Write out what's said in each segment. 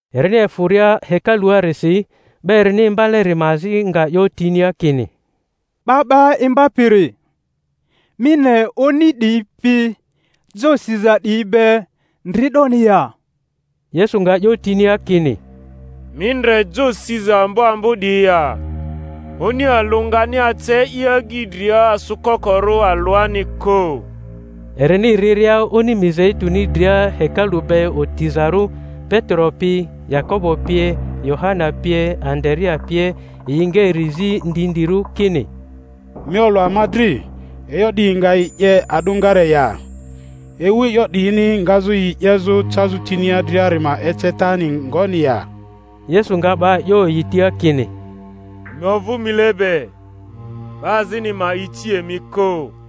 Erini efᴜria hekaluarisi, 'ba erini imbaleri ma azi nga 'yotinia kini, 'Ba 'ba Imbapiri, mi ne oni 'diyi pi jo siza 'diyi be ndri 'doni ya! Yesu nga 'yo tinia kini, Mi ndre jo siza ambo ambo 'diyi ya? Oni alᴜ ngani ace i agyi dria asᴜkokorᴜ alᴜani kᴜ. Erini riria oni Mizeituni dria, hekalu be otizarᴜ, Petero pi, Yakobo pie, Yohana pie, Andarea pie, yi nga eri zi ndindirᴜ kini, Mi olᴜ ama dri e'yo 'diyi nga yi 'ye a'dᴜngare ya? Ewu e'yo 'diyini ngazᴜ yi 'yezᴜ cazᴜ tinia driari ma ecetani ngoni ya? Yesu nga 'ba 'yo yi tia kini, Emi ovᴜ mile be, 'ba azini ma ici emi kᴜ.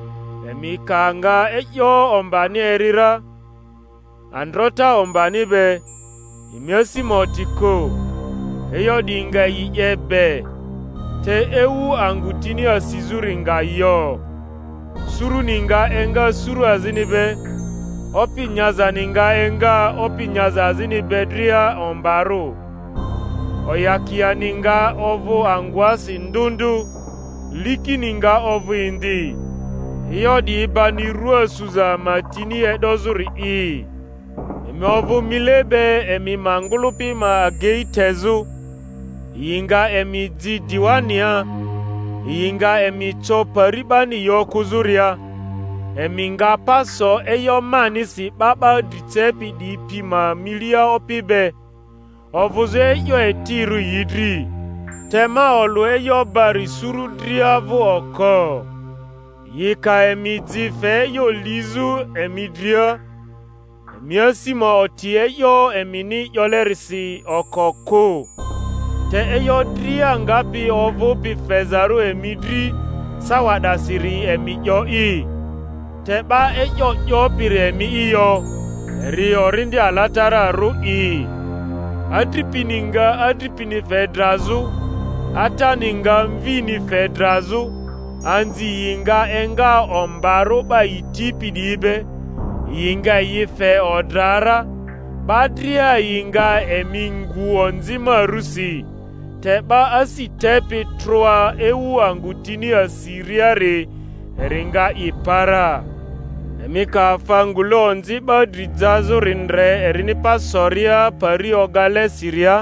Emi ka nga e'yo ombani eri ra, androta ombani be, emi asi ma oti kᴜ; e'yo 'diyi nga yi 'ye be, te ewu angᴜ tini asizᴜri nga yo. Suruni nga enga suru azini be, opi nyazani nga enga opi nyaza azini be dria ombarᴜ; oyakiani nga ovᴜ angᴜasi ndᴜ ndᴜ, likini nga ovᴜ indi; e'yo 'diyi bani rᴜa suza ma tini e'dozᴜri'i. Emi ovᴜ mile be emi ma ngᴜlᴜpi ma agei tezᴜ; yi nga emi ji diwania; yi nga emi co pari 'bani yi okᴜzᴜria; emi nga pa so e'yo manisi 'ba 'ba dri cepi 'diyi pi ma milia opi be, ovᴜzᴜ e'yo etirᴜ yi dri. Te ma olᴜ e'yo bari suru dria vᴜ oko. Yi ka emi ji fe e'yo lizᴜ emi dria, emi asi ma oti e'yo emini 'yolerisi oko kᴜ; te e'yo dria ngapi ovᴜpi fezarᴜ emi dri sawa 'dasiri emi 'yo'i, te 'ba e'yo 'yopiri emi'i yo, eri Orindi Alatararᴜ'i. Adripini nga adripini fe drazᴜ, atani nga mvini fe drazᴜ, anzi yi nga enga ombarᴜ 'ba yi tipi 'diyi be, yi nga yi fe odra ra; 'ba dria yi nga emi ngu onzi ma rusi. Te 'ba asi tepi troa ewu angᴜ tini asiriari, eri nga i pa ra. Emi ka afa ngule onzi 'ba dri jazᴜri ndre erini pa soria pari ogale siria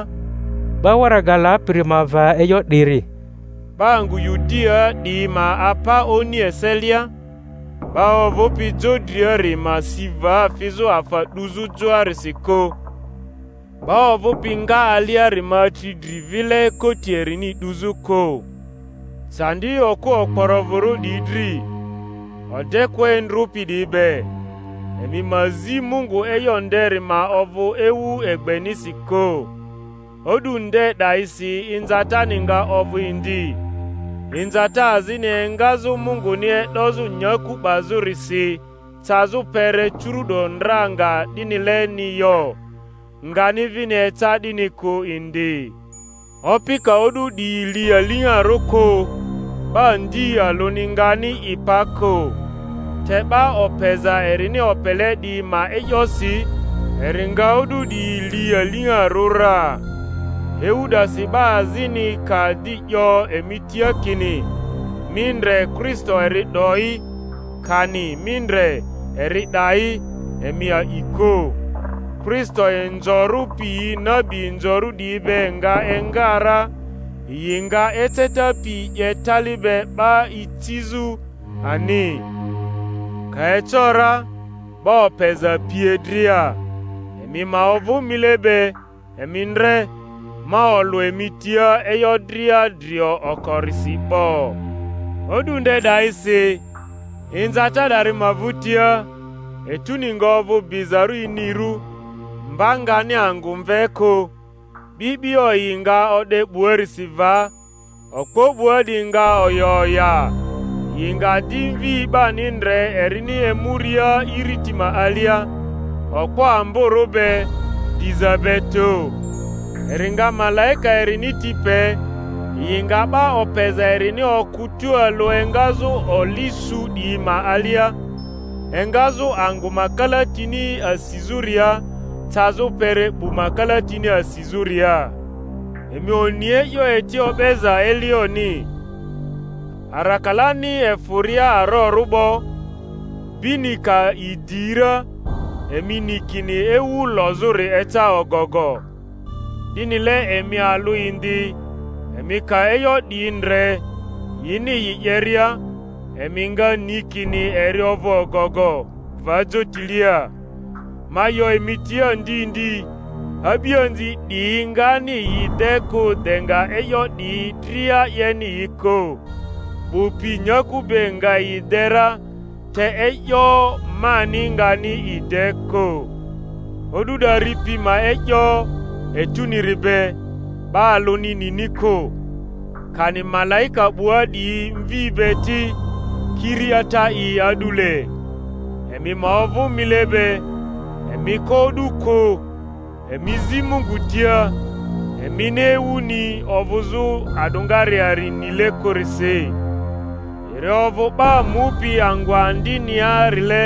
('ba waraga lapiri ma va e'yo 'diri), ba angᴜ Yudiaa 'diyi ma apa oni eselia; 'ba ovᴜpi jo driari ma si va fizᴜ afa 'duzᴜ joarisi kᴜ; 'ba ovᴜpi nga aliari ma atri dri vile koti erini 'duzᴜ kᴜ. Candi okᴜ okporovᴜrᴜ 'diyi dri, odekᴜa endrᴜpi 'diyi be. Emi ma zi Mungu e'yo nderi ma ovᴜ ewu egbenisi kᴜ. O'du nde 'dayisi inzatani nga ovᴜ indi, inzata azini engazᴜ Munguni e'dozᴜ nyaku 'bazᴜrisi cazᴜ kpere curu’do ndra nga 'dinileni yo, ngani vini eca 'dini kᴜ indi. Opi ka o'du 'diyi li aliŋarᴜ kᴜ, 'ba ndi alᴜni ngani i pa kᴜ; te 'ba opeza erini opele 'diyi ma e'yosi eri nga o'du 'diyi li aliŋarᴜ ra. Ewu 'dasi 'ba azini ka di 'yo emi tia kini, Mi ndre, Kristo eri 'do'i! kani, Mi ndre, eri 'da'i! emi a'i kᴜ. Kristo inzorᴜ piyi nabi inzorᴜ 'diyi be nga enga ra, yi nga eceta piyi 'ye tali be 'ba icizᴜ ani, ka eco ra, 'ba opeza pie dria. Emi ma ovᴜ mile be; emi ndre, ma olᴜ emi tia e'yo dria drio okorisi 'bo. O'du nde 'dayisi, inzata 'dari ma vᴜtia, etuni nga ovᴜ bizarᴜ inirᴜ, mba ngani angᴜ mve ku, 'bi'bio yi nga o'de 'buarisi va, okpo 'bua 'diyi nga oya oya. Yi nga di Mvi 'bani ndre erini emuria iriti ma alia, okpo amborᴜ be, diza be tᴜ. Eri nga malaika erini ti pe, yi nga 'ba opeza erini okᴜ tualᴜ engazᴜ oli su 'diyi ma alia, engazᴜ angᴜ ma kalatini asizᴜria cazᴜ kpere 'bu ma kalatini asizᴜria. Emi oni e'yo eti o'beza elioni: arakalani efᴜria aroru 'bo, bini ka idi ra, emi ni kini ewu lozᴜri eca ogogo. 'Dinile emi alᴜ indi, emi ka e'yo 'diyi ndre, yini yi 'yeria, emi nga ni kini eri ovᴜ ogogo, va jotilia. Ma 'yo emi tia ndi ndi, a'bianzi 'diyi ngani yi de kᴜ de nga e'yo 'diyi dria 'yeni yi kᴜ. 'Bᴜ pi nyaku be nga yi de ra, te e'yo mani ngani i de kᴜ. O'du 'dari pi ma e'yo, etuniri be, 'ba alᴜni nini kᴜ, kani malaika 'bua 'diyi Mvi be ti, kiri Ata'i a'dule. Emi ma ovᴜ mile be, emi ko o'du kᴜ, emi zi Mungu tia; emini ewuni ovᴜzᴜ a'dᴜngareari nile kᴜrisi. Eri ovᴜ 'ba mupi angᴜ andiniarile,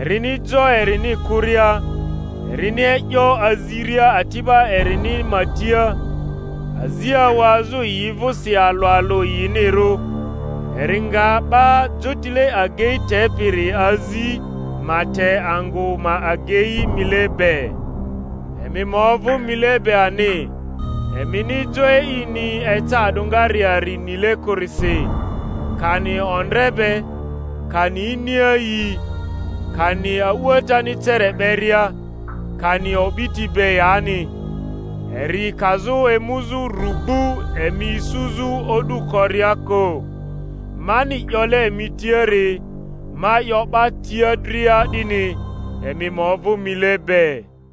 erini jo erini kᴜria, erini e'yo aziria ati'ba erini ma tia, azi awazᴜ yi vᴜsi alᴜ alᴜ yinirᴜ, eri nga 'ba jotile agei tepiri azi ma te angᴜ ma agei mile be. Emi ma ovᴜ mile be ani—emini jo e'ini eca a'dᴜngareari nile kᴜrisi, kani ondre be, kani iniayii, kani a'uatani cere 'beria, kani o'biti be yani eri kazᴜ emuzᴜ rugbu emi isuzᴜ o'du koria kᴜ. Mani 'yole emi tiari, ma 'yo 'ba tia dria 'dini: Emi ma ovᴜ mile be.